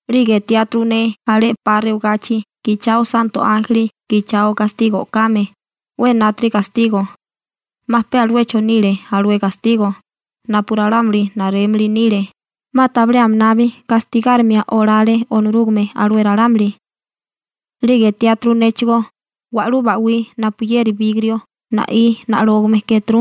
'Lige etiáturu ne alé 'pa rewagachi gichao santo ánjeli gichao gastigo o'kame, 'we enátiri gastigo. 'Ma pe aluecho nile alué gastigo napu ralámuli narémili nile, 'ma tabilé aminabi gastigárima olale Onorúgame alué ralámuli. 'Lige etiáturu néchigó wa'lú ba'wí napuyeri bigrio na'í na'lógame kéturu,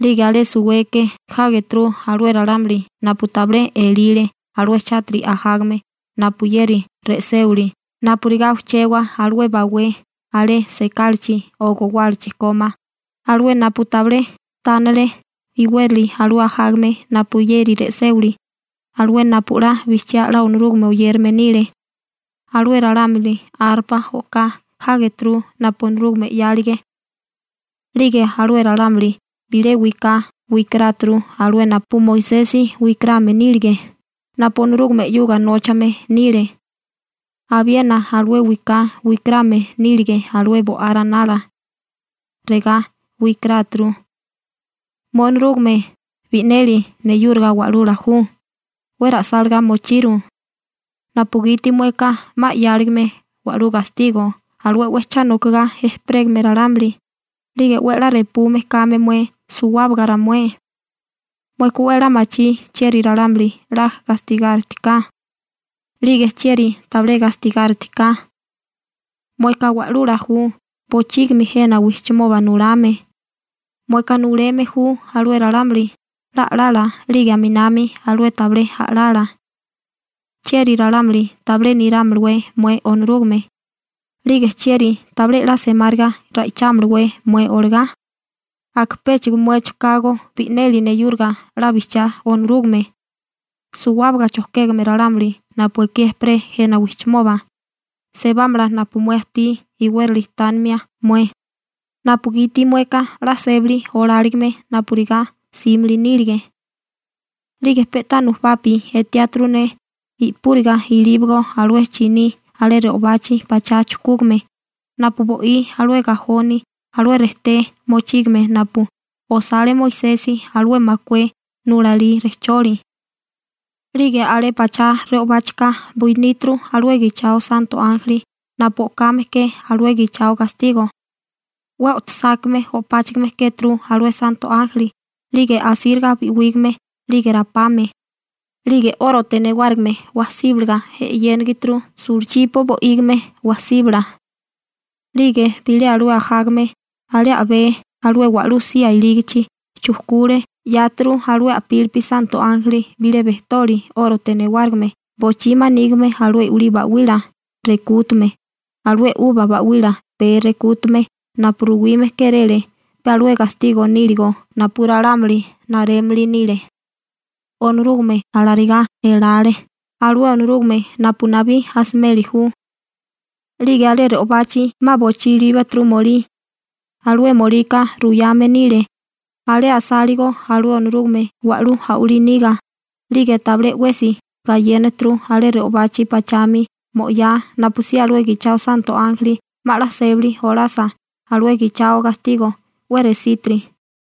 'lige alé suweke jágeturu alué ralámuli napu tabilé elile alué chátiri ajágame napuyeri re'séwili napurigá ujchewa alué bawé alé sekálachi o gowálachi kómá, alué napu tabilé tánale iwérali alué ajágame napuyeri re'séwili, alué napu 'la bijchiá 'la Onorúgame oyérame nile. Alué ralámuli arpa o'ká jágeturu napu Onorúgame 'yálige. 'Lige alué ralámuli bilé wiká wikaráturu alué napu Moisesi wikarame nílige, napu Onorúgame 'yuga nóchame nile. Abiena alué wiká wikarame nílige alué Bo'á Ranala. Regá wikaráturu: Mué Onorúgame, bi'neli neyúriga Wa'lula ju, 'we ra'sálagá mochiru napugiti mueka 'ma 'yáligame wa'lú gastigo alué 'we cha nokagá ejperégame ralámuli 'lige 'we 'la repume kame mué suwábaga ramué. Mueka 'we 'la machí chieri ralámuli 'la gastigáritiká 'lige chieri tabilé gastigáritiká. Mueka Wa'lula ju bochígimi jena wijchimoba nulame. Mueka nuleme ju alué ralámuli 'la a'lala 'lige aminami alué tabilé a'lala. ¿Chieri ralámuli tabilé nirámalawé mué Onorúgame, 'lige chieri tabilé 'la semáriga ra'ichámalawé mué olagá? Aka péchigo muecho kago bi'neli neyúriga 'la bijchiá Onorúgame. Suwábaga chojkégame ralámuli napu ekí ejperé jena wijchimoba, sebámala napu mué ajtí iwérali tánimia mué, napugiti mueka 'la sébali oláligime napurigá 'símili nílige. 'Lige pe'tá nujubapi etiáturu ne i'púriga ilíbago alué chiní alé re'obachi pachá chujkúgame, napu bo'í alué gajoni alué rejté mochígame napu osale Moisesi alué makué nulalí rejcholi. 'Lige alé pachá re'obáchika buiníturu alué gichao santo ánjeli napu o'kame ke alué gichao gastigo. 'We o'tosákame o'páchigime kéturu alué santo ánjeli, 'lige asíriga bi'wígame 'lige rapame, 'lige 'órote newárigime wasíbalaga e'yénigituru sulachipo bo'ígime wasíbala. 'Lige bilé alué ajágame alé a'bé alué wa'lú sía ilígichi chujkule 'yáturu alué a'pílipi santo ánjeli bilé bejtoli 'órote newárigime bochí manígime alué i'wilí ba'wila rekútume, alué 'uba ba'wila pee rekútume napu ruwime kéréle pe alué gastigo níligo napu ralámuli narémili nile. Onorúgame alarigá elale, alué Onorúgame napu nabí asimeli ju. 'Lige alé re'obachi 'ma bochí ilíbaturu molí. Alué molika ruyame nile alé asáligo alué Onorúgame wa'lú a'walí niga, 'lige tabilé 'wesi gayénaturu alé re'obachi pachami mo'yá napusí alué gichao santo ánjeli 'ma 'la sébali olasa alué gichao gastigo 'we resítiri.